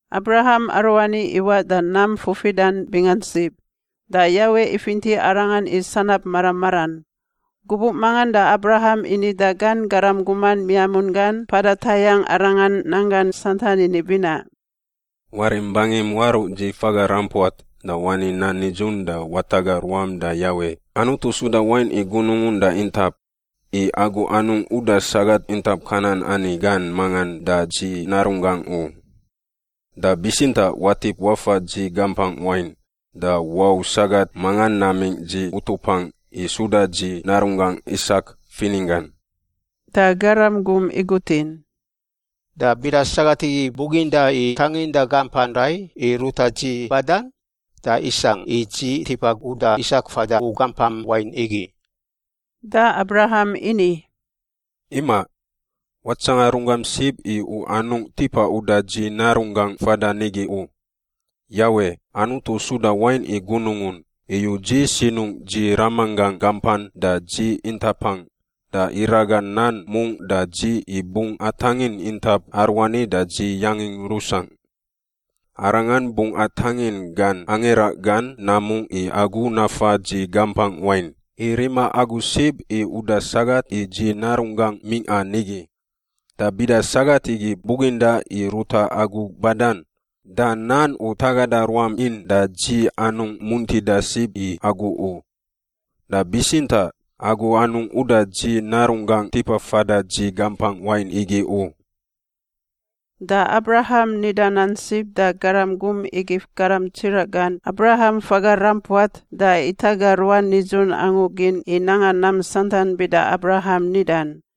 Abraham aruani iwaꞌ da nam fufidan bingan sib, da Yawe ifinti arangan i sanab mara maran. Gubuꞌ mangan da Abraham ini da gan garam guman miamun gan mpada tayangꞌ arangan nanggan santan ini binaꞌ, “Warim bangim waruꞌ dzi faga rampuat da wani nan nidzun da wataga ruam da Yawe, Anutu suda wain i gunungun da intap, i agu anungꞌ uda sagat intap Kanan ani gan mangan da dzi narunggangꞌ u. Da bitsintaꞌ watip wafa dzi gampangꞌ wain da wau sagat mangan namingꞌ dzi utupangꞌ i suda dzi narunggangꞌ Isak fininggan.” Da garam gum igutin, “Da bida sagat igi buginda i tanginda gampan rai i ruta dzi badan? Da isangꞌ i dzi tipa uda Isak fada u gampam wain igi?” Da Abraham ini, “Imaꞌ. Watsanga runggam sib i u anungꞌ tipa uda dzi narunggangꞌ fadan nigi u. Yawe, Anutu suda wain i gunungun, iyu dzi sinungꞌ dzi ramanggangꞌ gampan da dzi intapangꞌ da iraga nan mungꞌ da dzi i bungꞌ atangin intap aruani da dzi yangin rusangꞌ. Arangan bungꞌ atangin gan angira gan namungꞌ i agu nafa dzi gampangꞌ wain, i rima agu sib i uda sagat i dzi narunggangꞌ mingꞌa nigi. Da bida sagat igi buginda i ruta agu badan, da nan u tagada ruam in da dzi anungꞌ muntida sib i agu u. Da bitsintaꞌ agu anungꞌ uda dzi narunggangꞌ tipa fada dzi gampangꞌ wain igi u.” Da Abraham nida nan sib da garam gum igif garam tsiraꞌ gan Abraham faga rampuat da itaga ruan nidzun angu gin i nanga nam santan bida Abraham nidan.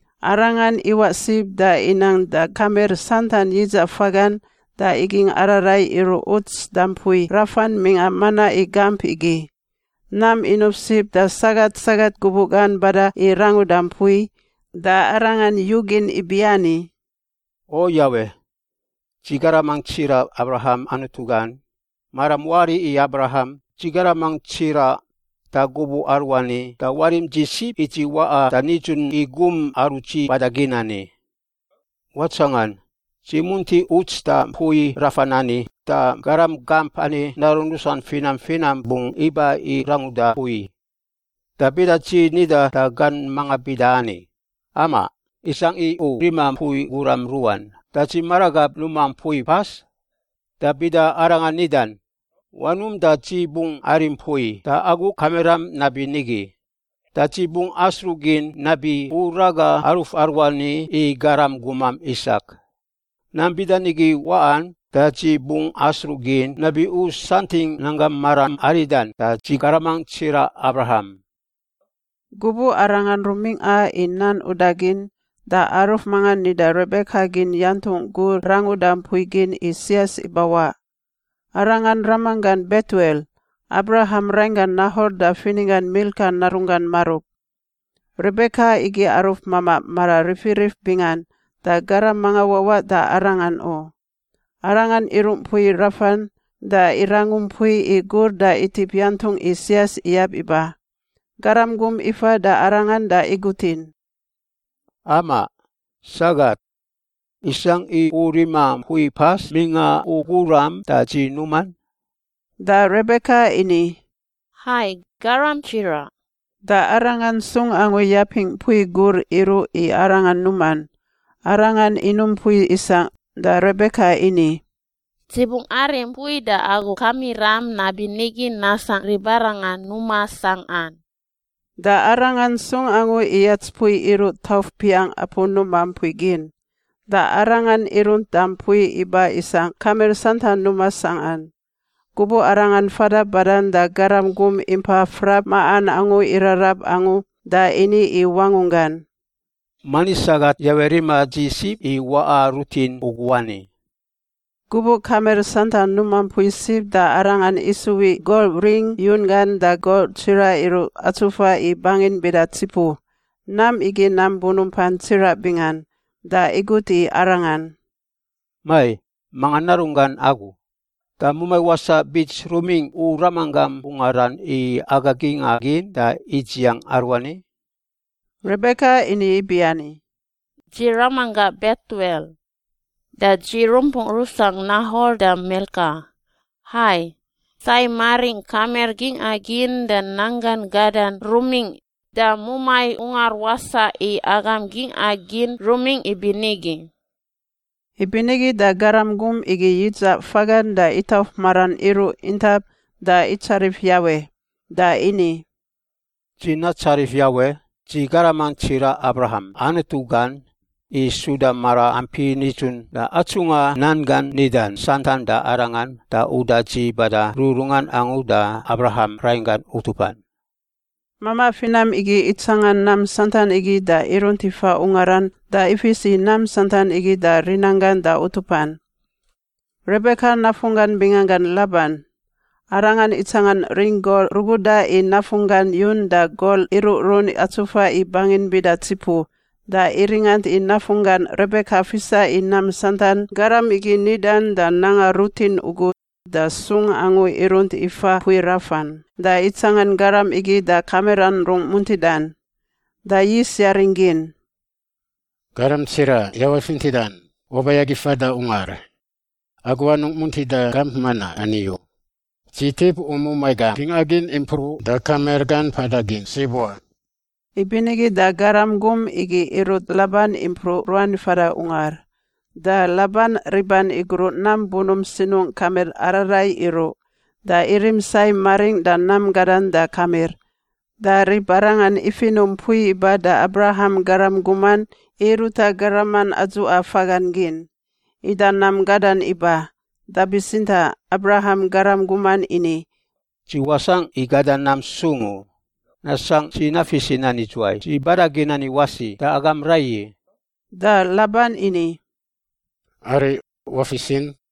Arangan iwaꞌ sib da inang da kamir santan yidzaꞌ fagan da igingꞌ ararai iruꞌ uts da mpui rafan mingꞌa manaꞌ i gamp igi. Nam inuf sib da sagat sagat gubuꞌ gan bada i ranguda mpui. Da arangan yugin ibiani, “O Yawe, dzi garamangꞌ tsiraꞌ Abraham Anutu gan, maram wari i Abraham, dzi garamangꞌ tsiraꞌ, da gubuꞌ aruani da warim dzi sib i dzi waꞌa da nidzun i gum aru dzi bada gin ani. Watsangan, dzi munti uts da mpui rafan ani da garam gamp ani narun rusan finam finam bungꞌ iba i ranguda mpui. Da bida dzi nida da gan mangan bida ani, ‘Amaꞌ, isangꞌ i u rima mpui guram ruꞌan da dzi maragab numa mpui pas?’ Da bida arangan nidan, ‘Wanum da dzi bungꞌ arim mpui da agu kamiram nabinigi,’ da dzi bungꞌ asruꞌgin nabi U raga aruf aruani i garam gumam Isak. Nam bida nigi waꞌan da dzi bungꞌ asruꞌ gin nabi U santingꞌ nanggam maram aridan da dzi garamangꞌ tsiraꞌ Abraham.” Gubuꞌ arangan rumingꞌa i nan udagin, da aruf mangan nida Rebeka gin yantungꞌ gur ranguda mpui gin i sias ibawaꞌ. Arangan ramanggan Betuel, Abraham rainggan Nahor da fininggan Milka narunggan marub. Rebeka igi aruf mamaꞌ mara rifirif bingan da garam manga wawaꞌ da arangan u. Arangan iruꞌ mpui rafan da irangu mpui i gur da itip yantungꞌ i sias iyab iba. Garam gum ifa da arangan da igutin, “Amaꞌ, sagat, isangꞌ i u rima mpui pas mingꞌa u guram da dzi numan?” Da Rebeka ini, “Hai, garam tsiraꞌ,” da arangan sung angu yapingꞌ mpui gur iruꞌ i arangan numan. Arangan inum mpui isangꞌ da Rebeka ini, “Dzi bungꞌ arim mpui da agu kamiram nabinigi nasangꞌ ribarangan numa sangꞌan.” Da arangan sung angu iyats mpui iruꞌ tauf piangꞌ apu numa mpui gin. Da arangan irunt da mpui iba isangꞌ kamir santan numa sangꞌan. Gubuꞌ arangan fada badan da garam gum impa frap maꞌan angu irarab angu da ini i wangunggan, “Mani sagat Yawe rima dzi sib i waꞌa rutin ugu ani.” Gubuꞌ kamir santan numa mpui sib da arangan isuwiꞌ gol ring yun gan da gol tsiraꞌ iruꞌ atsufa i bangin bida tsipu. Nam igi nam bunumpan tsiraꞌ bingan. Da igut i arangan, “Mai! Manga narunggan agu? Da mumai wasaꞌ bits rumingꞌ u ramanggam ungaran i aga gingꞌa gin da idziang aruani?” Rebeka ini ibiani, “Dzi ramanggangꞌ Betuel. Da dzi rumpungꞌ rusangꞌ Nahor da Milka. Hai. Sai maringꞌ kamir gingꞌa gin da nanggan gadan rumingꞌ, da mumai ungar wasaꞌ i agam gingꞌa gin rumingꞌ ibinigi.” Ibinigi da garam gum igi yidzaꞌ fagan da itauf maran iruꞌ intap da itsarif Yawe. Da ini, “Dzi natsarif Yawe, dzi garamangꞌ tsiraꞌ Abraham Anutu gan, i suda maraampi nidzun da atsungꞌa nan gan nidan santan da arangan da uda dzi bada rururungan angu da Abraham rainggan utupan.” Mamaꞌ finam igi itsangan nam santan igi da irunt ifa ungaran da ifis i nam santan igi da rinanggan da utupan. Rebeka nafunggan binganggan Laban. Arangan itsangan ring gol ruguda i nafunggan yun da gol iruꞌrun atsufa i bangin bida tsipu, da iringant i nafunggan Rebeka fisa i nam santan garam igi nidan da nanga rutin ugu, da sung angu irunt ifa mpui rafan da itsangan garam igi da kamiran rungꞌ muntidan. Da yis yaring gin, “Garam tsiraꞌ Yawe fintidan, waba i agi fada ungar. Agu anungꞌ muntida gamp manaꞌ ani u. Dzi tip u mumai gam gingꞌa gin impruꞌ da kamir gan mpada gin sib wa.” Ibinigi da garam gum igi irut Laban impruꞌ ruan fada ungar. Da Laban riban igruꞌ nam bunump sinungꞌ kamir ararai iruꞌ, da irim sai maringꞌ da nam gadan da kamir. Da ribarangan ifinuꞌ mpui iba da Abraham garam guman i ruta garaman adzuꞌa fagan gin. Ida nam gadan iba, da bitsintaꞌ Abraham garam guman ini, “Dzi wasangꞌ i gada nam sung u, nasangꞌ dzi nafis i nan idzuwai dzi bada gin ani wasi da agam raiyi.” Da Laban ini, “Ariꞌ, wafisin.”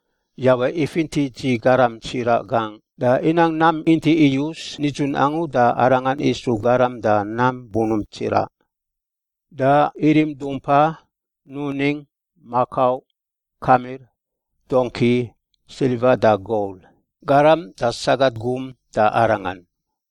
Yawe ifinti dzi garam tsiraꞌ gangꞌ da inang nam inti iyus nidzun angu da arangan isu garam da nam bunump tsiraꞌ. Da irim dumpa, nuning, makau, kamir, dongki, silva da gol, garam da sagat gum da arangan.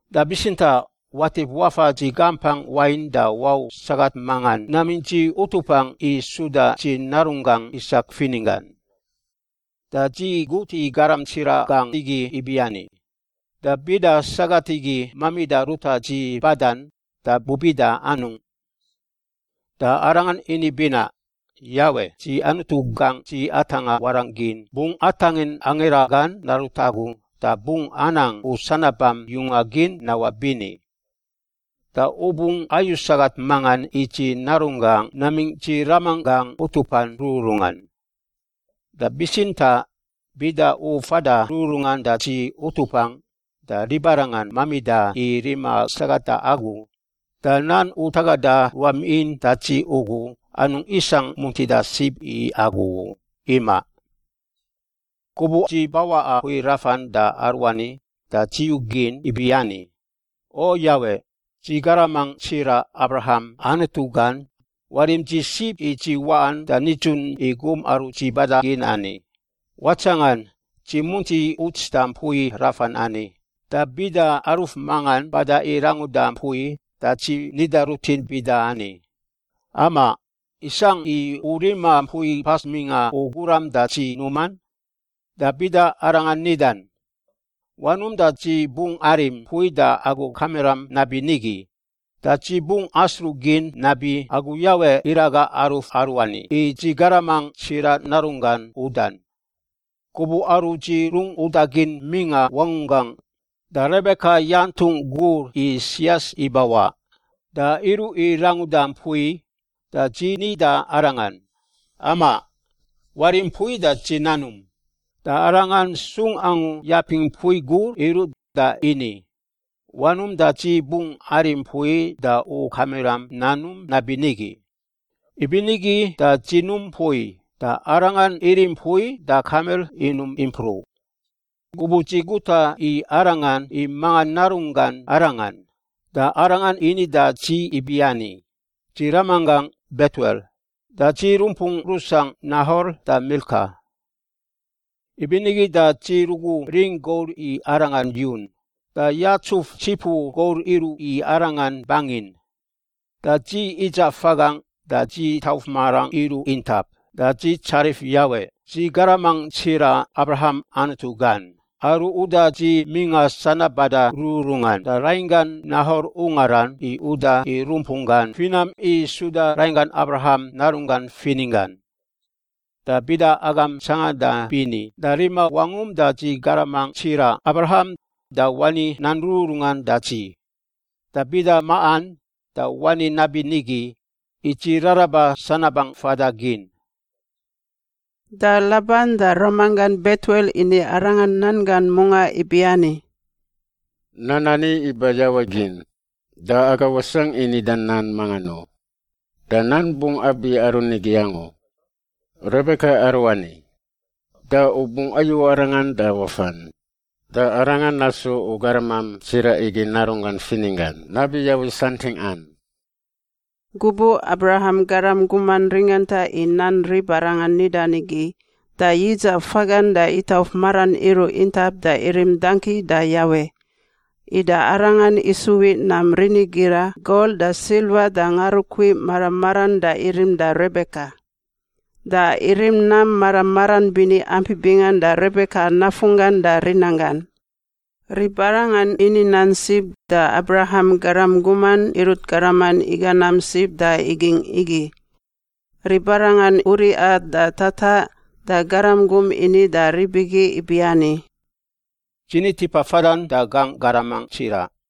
Da bitsintaꞌ watip wafa dzi gampangꞌ wain da wau sagat mangan namingꞌ dzi utupangꞌ i suda dzi narunggangꞌ Isak fininggan.’ Da dzi gut i garam tsiraꞌ gangꞌ igi ibiani, ‘Da bida sagat igi mamida ruta dzi badan, da bubida anungꞌ?’ Da arangan ini binaꞌ, ‘Yawe, dzi Anutu gangꞌ dzi atangꞌa warangꞌ gin, bungꞌ atangin angira gan narut agu da bungꞌ anang u sanabam yunga gin nawaꞌ bini. Da u bungꞌ ayu sagat mangan i dzi narunggangꞌ namingꞌ dzi ramanggangꞌ utupan rururungan. Da bitsintaꞌ bida u fada rururungan da dzi utupangꞌ, da ribarangan mamida i rima sagat da agu, da nan u tagada ruam in da dzi ugu anungꞌ isangꞌ muntida sib i agu u. Imaꞌ.’ “Gubuꞌ dzi bawaꞌa mpui rafan da aruani da dzi yugin ibiani, ‘O Yawe, dzi garamangꞌ tsiraꞌ Abraham Anutu gan, warim dzi sib i dzi waꞌan da nidzun i gum aru dzi bada gin ani. Watsangan, dzi munti uts da mpui rafan ani, da bida aruf mangan bada i ranguda mpui da dzi nida rutin bida ani, “Amaꞌ, isangꞌ i u rima mpui pas mingꞌa u guram da dzi numan?” Da bida arangan nidan, “Wanum da dzi bungꞌ arim mpui da agu kamiram nabinigi,” da dzi bungꞌ asruꞌ gin nabi Agu Yawe iraga aruf aruani i dzi garamangꞌ tsiraꞌ narunggan udan.’ Gubuꞌ aru dzi rungꞌ udagin mingꞌa wangunggangꞌ, da Rebeka yantungꞌ gur i sias ibawaꞌ, da iruꞌ i ranguda mpui da dzi ni da arangan, ‘Amaꞌ, warim mpui da dzi nanum.’ Da arangan sung angu yapingꞌ mpui gur iruꞌ da ini, ‘Wanum da dzi bungꞌ arim mpui da u kamiram nanum nabinigi.’ Ibinigi da dzi num mpui da arangan irim mpui da kamir inum impruꞌ. Gubuꞌ dzi guta i arangan i manga narunggan arangan, da arangan ini da dzi ibiani, ‘Dzi ramanggangꞌ Betuel. Da dzi rumpungꞌ rusangꞌ Nahor da Milka.’ “Ibinigi da dzi rugu ring gol i arangan yun da yatsuf tsipu gol iruꞌ i arangan bangin, da dzi idzaꞌ fagangꞌ da dzi tauf marangꞌ iruꞌ intap da dzi tsarif Yawe, dzi garamangꞌ tsiraꞌ Abraham Anutu gan, aru uda dzi mingꞌa sanab bada rururungan da rainggan Nahor ungaran i uda i rumpunggan finam i suda rainggan Abraham narunggan fininggan. Da bida agam tsanganda bini da rima wangum da dzi garamangꞌ tsiraꞌ Abraham da wani nan rururungan da dzi, da bida maꞌan da wani nabinigi, i dzi raraba sanabangꞌ fada gin.” Da Laban da ramanggan Betuel ini arangan nan gan mungaꞌ ibiani, “Nan ani iba Yawe gin, da aga wasangꞌ i nida nan mangan u. Da nan bungꞌ abi aru nigi angu. Rebeka aruani. Da u bungꞌ ayu arangan da wafan, da arangan nasu u garamam tsiraꞌ igi narunggan fininggan nabi Yawe santingꞌan.” Gubuꞌ Abraham garam guman ringanta i nan ribarangan nidan igi, da yidzaꞌ fagan da itauf maran iruꞌ intap da irim dangki da Yawe. Ida arangan isuwiꞌ nam rinigira gol da silva da ngarukui mara maran da irim da Rebeka. Da irim nam mara maran bini ampi bingan da Rebeka nafunggan da rinanggan. Ribarangan ini nan sib da Abraham garam guman irut garaman iga nam sib da igingꞌ igi. Ribarangan uriꞌa da tataꞌ da garam gum ini da rib igi ibiani, “Dzi ni tipa fadan da gangꞌ garamangꞌ tsiraꞌ.”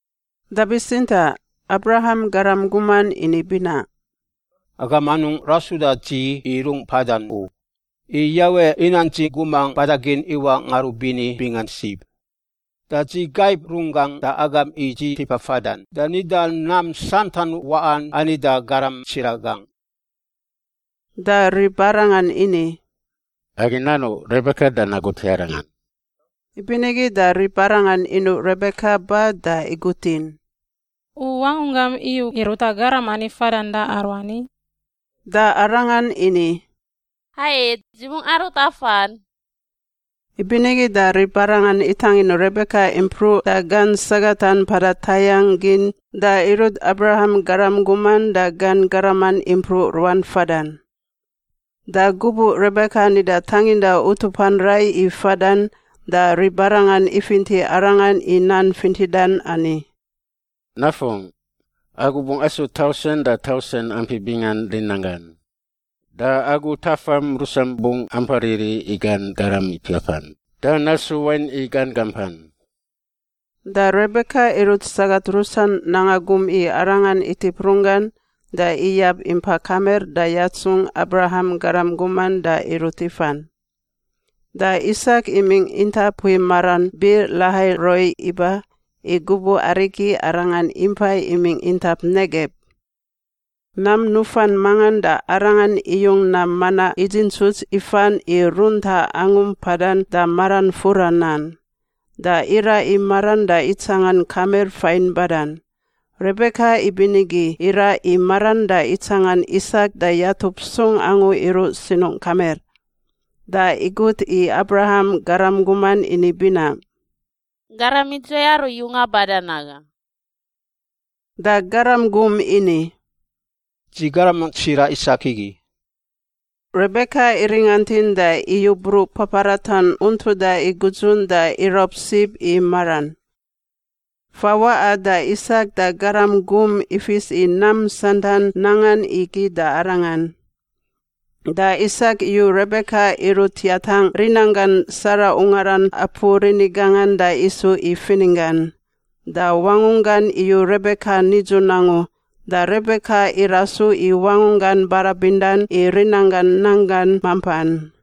Da bitsintaꞌ Abraham garam guman ini binaꞌ, “Agam anungꞌ rasuda dzi i rungꞌ mpadan u. I Yawe inang dzi gumangꞌ bada gin iwaꞌ ngarubini bingan sib. Da dzi gaib runggangꞌ da agam i dzi tipa fadan da nida nam santan waꞌan ani da garam tsiraꞌ gangꞌ.” Da ribarangan ini, “Agi nanuꞌ Rebeka da nagut i arangan.” Ibinigi da ribarangan inuꞌ Rebeka ba da igutin, “U wangunggam iyu i ruta garam ani fadan da aruani?” Da arangan ini, “Hai, dzi bungꞌ arut afan.” Ibinigi da ribarangan itangin Rebeka impruꞌ da gan sagatan mpada tayangꞌ gin da irut Abraham garam guman da gan garaman impruꞌ ruan fadan. Da gubuꞌ Rebeka nida tanginda utupan rai i fadan, da ribarangan ifinti arangan i nan fintidan ani, “Nafungꞌ, agu bungꞌ asu tausen da tausen ampi bingan rinanggan! Da agu tafam rusam bungꞌ ampa riri i gan garam ipiapan da nasu wain i gan gampan.” Da Rebeka irut sagat rusan nanga gum i arangan itip runggan da iyab impa kamir da yatsungꞌ Abraham garam guman da irut ifan. Da Isak imingꞌ intap mpui maran Bir-Lahai-Roi iba, i gubuꞌ arigi arangan impai imingꞌ intap Negeb. Nam nufan mangan da arangan iyung nam manaꞌ idzintsuts ifan i runtaꞌ angu mpadan da maran fura nan. Da iraꞌ i maran da itsangan kamir fain badan. Rebeka ibinigi iraꞌ i maran da itsangan Isak da yatup sung angu iruꞌ sinungꞌ kamir. Da igut i Abraham garam guman ini binaꞌ, “Garam idzuwai aru yunga badan naga?” Da garam gum ini, “Dzi garamangꞌ tsiraꞌ Isak igi.” Rebeka iringantin da iyu bruꞌ paparatan untuda i gudzun da iraub sib i maran. Fawaꞌa da Isak da garam gum ifis i nam santan nangan igi da arangan. Da Isak iyu Rebeka irut yatangꞌ rinanggan Sara ungaran apu rini gangan da isu i fininggan. Da wangunggan iyu Rebeka nidzun angu, da Rebeka irasu i wangunggan barabindan i rinanggan nanggan mampan.